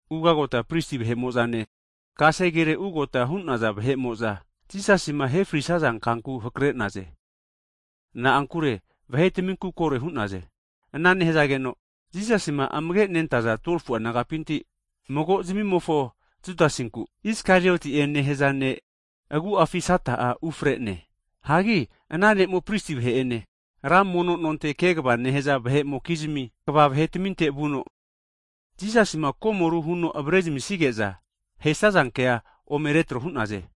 ugagota pristi vahe'mo'zane kasegere ugota hu'naza vahe'mo'za Jisasima ahefrisaza kanku hake'naze. Na'ankure vahetaminku kore hu'naze. Ana nehazageno, Jisasima amage'manentaza 12fu'a disaipol nagapinti, mago zmimofo Judasinku, Iskarioti'e nehaza ne' agu'afi Sata'a ufre'ne. Hagi ana ne'mo'a pristi vahe'ene, ra mono nonte kegava nehaza vahe'mokizmi kva vahetaminte vuno, Jisasima komoru huno avare zamisige'za ahesaza kea ome retro hu'naze.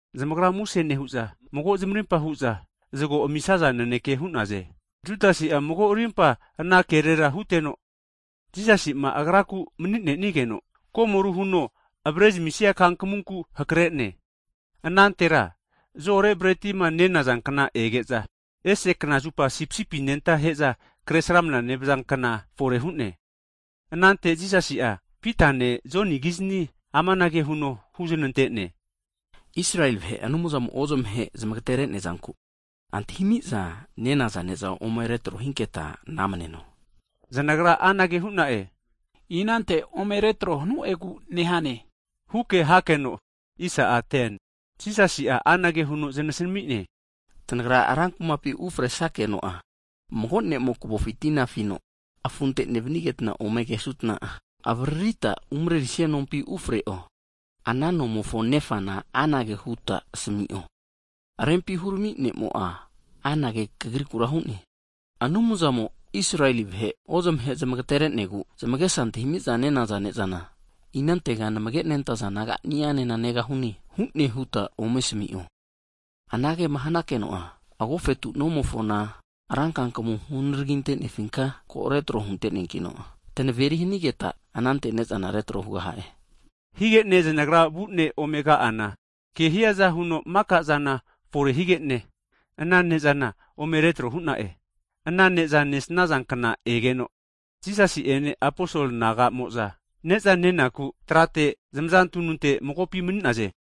Zamagra muse nehu'za, mago zamarimpa hu'za zago amisaza naneke hu'naze. Judasi'a mago rimpa ana kerera huteno, Jisasi'ma Agraku mani'nenigeno, komoru huno avrezamisia kankamunku hakre'ne. Anantera zo'ore bretima nenaza kna ege'za, ese knazupa sipisipi anenta ahe'za Kresramana (Pasova) nevaza kna fore hu'ne. Anante Jisasi'a Pitane Jonigizni amanage huno huzanante'ne, Israeli vahe'ma Anumzamo'ma ozmahe zamagatere'nea zanku antahimiza nenaza ne'za retro hinketa ome namneno. Zanagra anage hu'na'e, inante ome retro hanu'egu nehane? huke hakeno, Jisasi'a anage huno zanasami'ne, Tanagra rankumapi ufresakeno'a, mago ne'mo kavofi tina afino afunte nevanigetna ome kesanutna'a, avaririta umarerisia nompi ufre'o. Ana nomofo nefana anage huta asami'o, Rempi hurami ne'mo'a anage kagrikura hu'ne. Anumzamo'ma Israeli vahe ozmahe zamagatere'negu zamagesa antahimiza nenaza ne'zana, inantega namage nentaza disaipol nagani'anena negahune? hune huta ome asami'o. Anagema hanakeno'a, agofetu nomofona, ra kankamu hunaragintenefinka ko retro hunteneankino, tanaveri hanigeta, anante ne'zana retro hugaha'e. Higene zanagra vune ome ka'ana, kehiaza huno makazana fore higene, ana ne'zana ome retro hu'na'e. Ana ne'za nesnaza kna egeno, Jisasi'ene aposol naga'mo'za, ne'za nenaku trate zamaza tununte magopi mani'naze.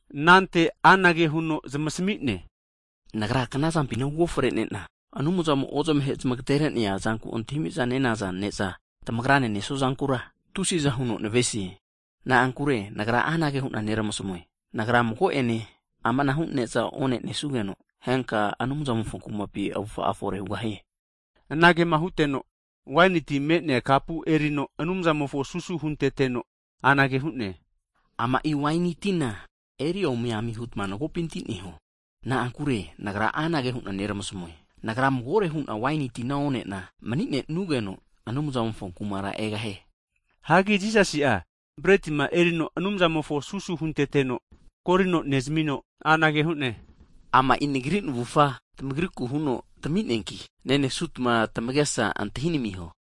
Anante anage huno zamasami'ne, Nagra knazampina uofrenena, Anumzamo ozmaheno zmagaterenea zanku antahimiza nenaza ne'za tamagrane nesuazankura tusiza huno navesie. Na'ankure Nagra anage hu'na neramasamue, Nagra mago'ene amanahu ne'za onenesugeno, henka Anumzamofo Kumapi avufa'a fore hugahie. Anagema huteno, Jisasi'a waini ti me'nea kapu erino Anumzamofo susu hunteteno, anage huno hu'ne, Ama'i waini tina eriomi ami hutma magopinti neho. Na'ankure Nagra anage huna neramasamue, Nagra magore hu'na waini tina onena maninenugeno, Anumzamofo Kumara egahie. Hagi Jisasi'a bretima erino Anumzamofo susu hunteteno korino nezamino anage hu'ne, Ama'i Nagri navufa tamagrikure huno tami'neanki, nenesutma tamagesa antahinamiho.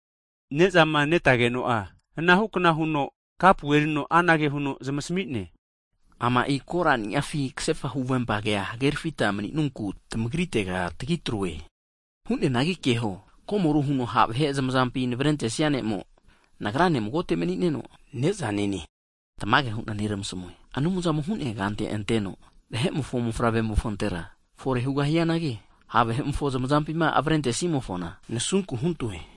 Ne'zama netageno'a, anahukna huno kapu erino anage huno zamasmi'ne, Ama'i korani'afi kasefa huvempage hagerafita maninunku tamagritera tagitroe. Hu'neanagi keho, komoru huno ha' vahe zamazampi navrentesnia ne'mo, Nagrane magote mani'neno neza nene. Tamage hu'na neramasamue, Anumzamo hu'nea kante anteno, Vahe'mofo Mofavre'mofontera fore hugahianagi, ha' vahe'mofo zamazampima avrentesimofona, nasunku huntoe!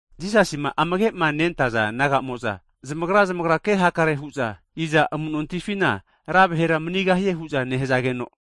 Jisasima amage'ma nentaza disaipol naga'mo'za, zamagra zamagra kehakare hu'za, i'za amu'nontifina ra vahera manigahie hu'za nehazageno,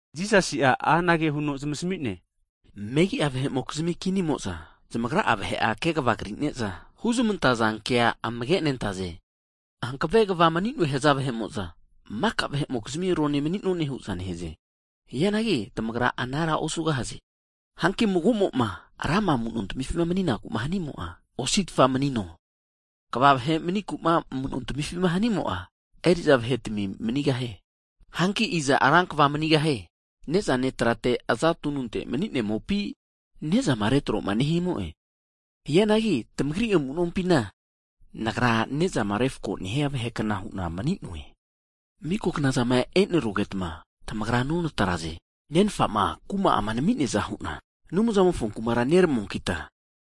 Jisasi'a anage huno zamasami'ne, Megi'a vahe'mokizmi kinimo'za zamagra'a vahera kegava krineza huzmantaza kea amage'nentaze. Hankave kva mani'noe haza vahe'mo'za, maka vahe'mokizmi rone mani'none hu'za nehaze. Hianagi tamagra anara osugahaze. Hanki mago'mo'ma ra vahema amu'nontamifima mani'naku hanimo'a, osi'tfa manino. Kva vahe maniku amu'nontamifi hanimo'a, eri'za vahetami manigahie. Hanki i'za rankvama manigahie. Nezane trate aza tununte maninemopi? Nezama retroma nehimo'e. Hianagi tamagri amu'nompina, Nagra ne'zama refkoma nehia vahekna hu'na mani'noe. Miko knazama e'nerugeta, tamagra nonatraze. Nenfama kuma'ama nami'neaza hu'na, Anumzamofo kumara neramuankita,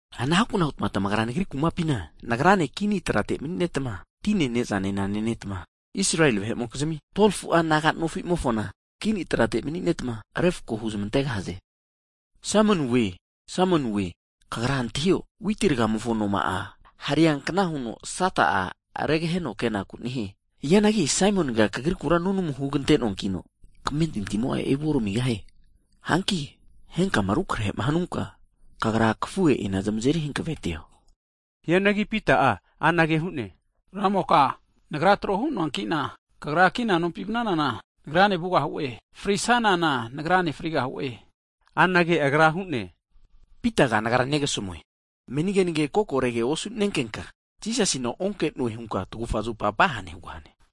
anahukna hutma tamagra Nagri kumapina, Nagrane kini trate maninetma, tine nezane nenetma, Israeli vahe'mokizmi 12fu'a naga nofimofona kini trate maninetma refko huzmantegahaze. Saimoniwoe Saimoniwoe, kagra antahio, witi rgamofo anoma'a hareankna huno Sata'a regaheno kenaku nehie. Hianagi Saimoniga kagrikura nunamu hugantenoankino, kamentintimo'a evu oramigahie. Hanki henkama rukrahe'ma hanunka, kagra kafuhe'ina zamazeri hanavetio. Hianagi Pita'a anage hu'ne, Ramoka, nagra tro hunoankina, Kagra kina nompi vnanana, nagrane vugahu'e. Frisanana nagrane frigahu'e. Higeno anage Agra hu'ne, Pitaga Nagra negasamue, meni kenage kokorege osu'nenkenka, Jisasina onke'noe, hunka tagufa zupa vahane hugahane.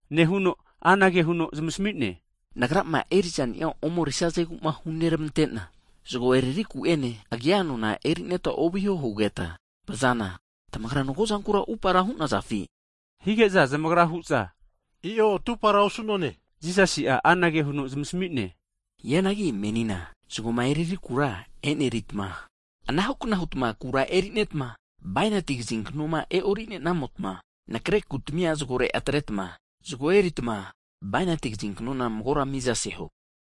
Nehuno anage huno zamasami'ne, Nagrama erizania omerisazeguma hunermantena, zago eriri ku'ene, agia nona erineta ovihoma hugeta vazana, tamagra magozankura atupara hu'nazafi? Hige'za zamagra hu'za, i'o atupara osu'none hu'naze. Jisasi'a anage huno zamasami'ne, Hianagi menina, zagoma eriri kura enerita, anahukna hutma kura eneritma, bainati kaziknoma e'orinenamotma nakre (saket) kutmia zagore atretma zago eritma bainati kazinknona magora mizaseho.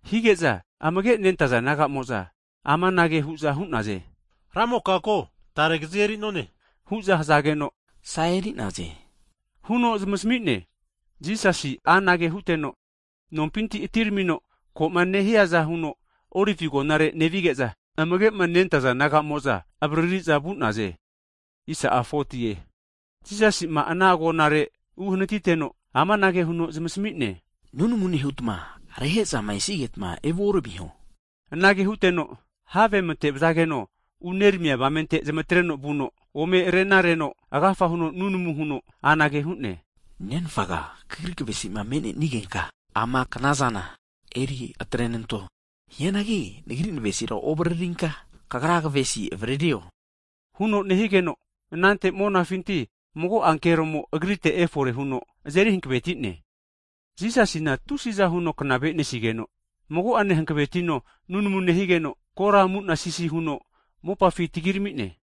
Hige'za amage'ma nentaza disaipol naga'mo'za amanage hu'za hu'naze, Ramoka ko, tare kazi eri'none hu'za hazageno, Sa eri'naze, huno zamasmi'ne. Jisasi'a anage huteno, nompinti atiramino koma nehiaza huno Olivi agonare nevige'za, amagema nentaza disaipol naga'mo'za avariri'za vu'naze. Jisasi'a ana agonare uhanatiteno, amanage huno zamasami'ne, Nunamu nehutma reramehe'zama esigetma evuoramiho. Anage huteno, have matevazageno uneramia avamente zamatreno vuno, ome renarenamagino agafa huno nunamu huno, anage hu'ne, Nenfaga Kagri kavesima me'nenigenka ama knazana eri atrenanto. Hianagi nagri navesira ovaririnka, Kagra kavesi avaririo, huno nehigeno, anante monafinti mago ankeromo Agrite efore huno azeri hankavetine. Jisasina tusiza huno knavenesigeno, mago'ane hanavetino nunamu nehigeno, kora amunasisi huno mopafi tagiramine.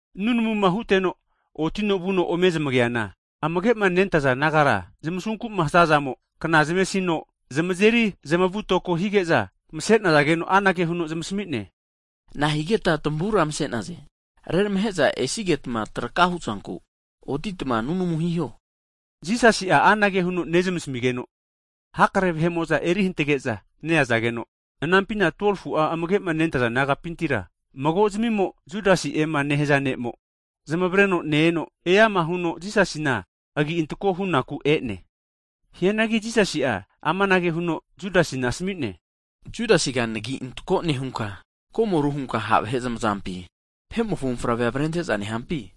Nunamuma huteno otino vuno ome zmageana, amagema nentaza disaipol nagara zamasunkuma hazazamo kna zamesino, zamazeri zamavutoko hige'za mase'nazageno, anage huno zamasami'ne, Nahigeta tamavura mase'naze? Reramahe'za esigetma traka hu'zanku, otitma nunamu hiho. Jisasi'a anage huno nezmasamigeno, hakare vahekrefamoza eri hantage'za neazageno, ananpina 12fu'a amagema nentaza disaipol nagapintira magozamimo, Judasi'ema nehaza ne'mo zamavreno ne-eno, eama huno Jisasina agi'antako hunaku e'ne. Hianagi Jisasi'a amanage huno Judasina asami'ne, Judasiga nagi antako nehunka, komoru hunka ha' vahe zamazampi, Vahe'mofo Mofavre avrente'za nehampi?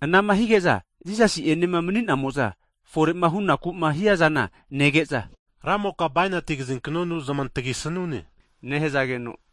Anama hige'za, Jisasi'enema mani'namo'za fore'ma hunaku'ma hiazana nege'za, Ramoka, bainati kazinkanonu zamantagi sanumpi? nehazageno,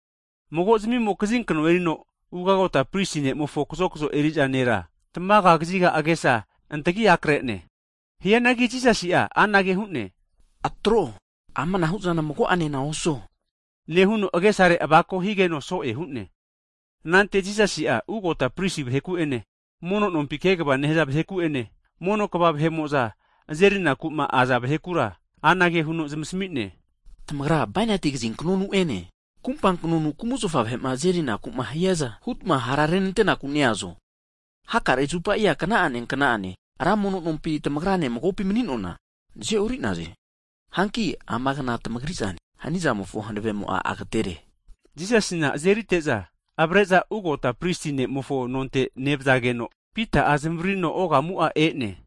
magozmimo bainati kazinkno erino ugagota pristi nemofo kazokzo eri'za nera tamaga kaziga agesa antagi akre'ne. Hianagi Jisasi'a anage hu'ne, Atro, amanahuzana mago'ane osuo nehuno, agesare avako higeno so'e hu'ne. Anante Jisasi'a ugota pristi vaheku'ene, mono nompi kegava nehaza vaheku'ene, mono kva vahe'mo'za azerinakuma aza vahekura anage huno zamasami'ne, Tamagra bainati kazinknonu'ene kumpa kanonu kumzafa vahe'ma azerinakuma hiaza hutma hara renantenaku neazo? Hakare zupa kna'ane kna'ane ra mono nompi tamagrane magopi mani'noana nazeori'naze. Hanki ama kna tamagrizane. Hanizamofo hanavemo'a agatere. Jisasina azerite'za avre'za ugota pristi ne'mofo nonte nevazageno, Pita'a zmavaririno ogamu'a e'ne.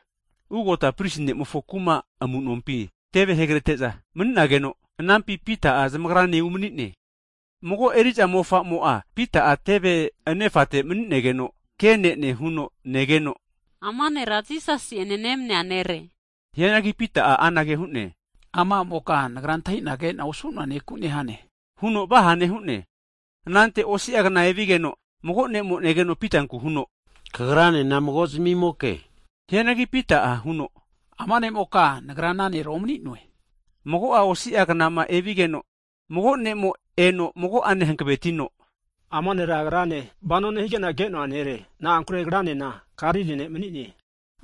Ugota pristi nemofo kuma amunompi teve hugrete'za, mani'nageno, anampi Pita'a zamagrane umani'ne. Mago eri'za mofamo'a Pita'ma teve anefate mani'negeno ke'nene huno negeno, ama nera Jisasi'ene nemania nere. Hianagi Pita'a anage hu'ne, ama a'moka nagra antahina kena osu'noa neku nehane huno vahane hu'ne. Anante osi'agna evigeno, mago nemo negeno Pitanku huno, kagranena mago zmimoke! Hianagi Pita'a huno, ama ne'moka nagra ana nera omani'noe! Mago'a osi'a (aua) knama evigeno, mago ne'mo eno mago'ane hankavetino, ama nera agrane vano nehigena kenoa nere. Na'ankure agranena Galili ne' mani'ne.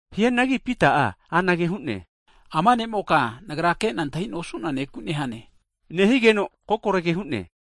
Hianagi Pita'a anage hu'ne, ama ne'moka, nagra kena antahina osu'noa neku nehane nehigeno, kokorege hu'ne.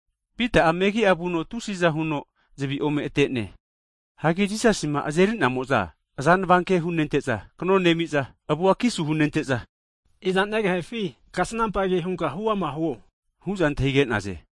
Pita'a megi'a vuno tusiza huno zavi ome ate'ne. Hagi Jisasima azeri'namo'za azanava ke hunente'za kano nemiza, avua kisu hunente'za, iza negehefi kasnampa ke hunka huama huo hu'za antahige'naze.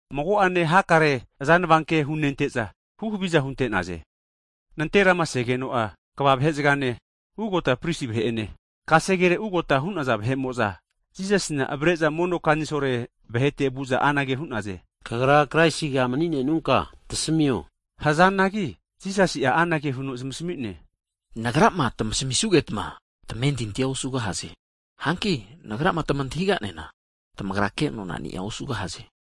Mago'ane hakare azanava ke hunente'za, huhaviza hunte'naze. Nanterama segeno'a, kva vahezagane, ugota pristi vahe'ene, kasegere ugota hu'naza vahe'mo'za, Jisasina avare'za mono kanisolo vahete vu'za anage hu'naze, Kagra Kraisiga maninenunka tasamio hazanagi, Jisasi'a anage huno zamasami'ne, Nagrama tamasamisugetma, tamentintia osugahaze. Hanki Nagrama tamantahiganena, tamagra kenonani'a osugahaze. hu'ne.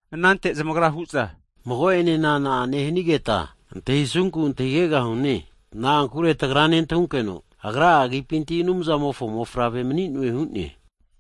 anante zamagra hu'za, mago'enena na'ane hanigeta antahisunku antahigegahune. Na'ankure tagra nentahunkeno Agra'a agipinti Anumzamofo mofavre mani'noe hu'ne.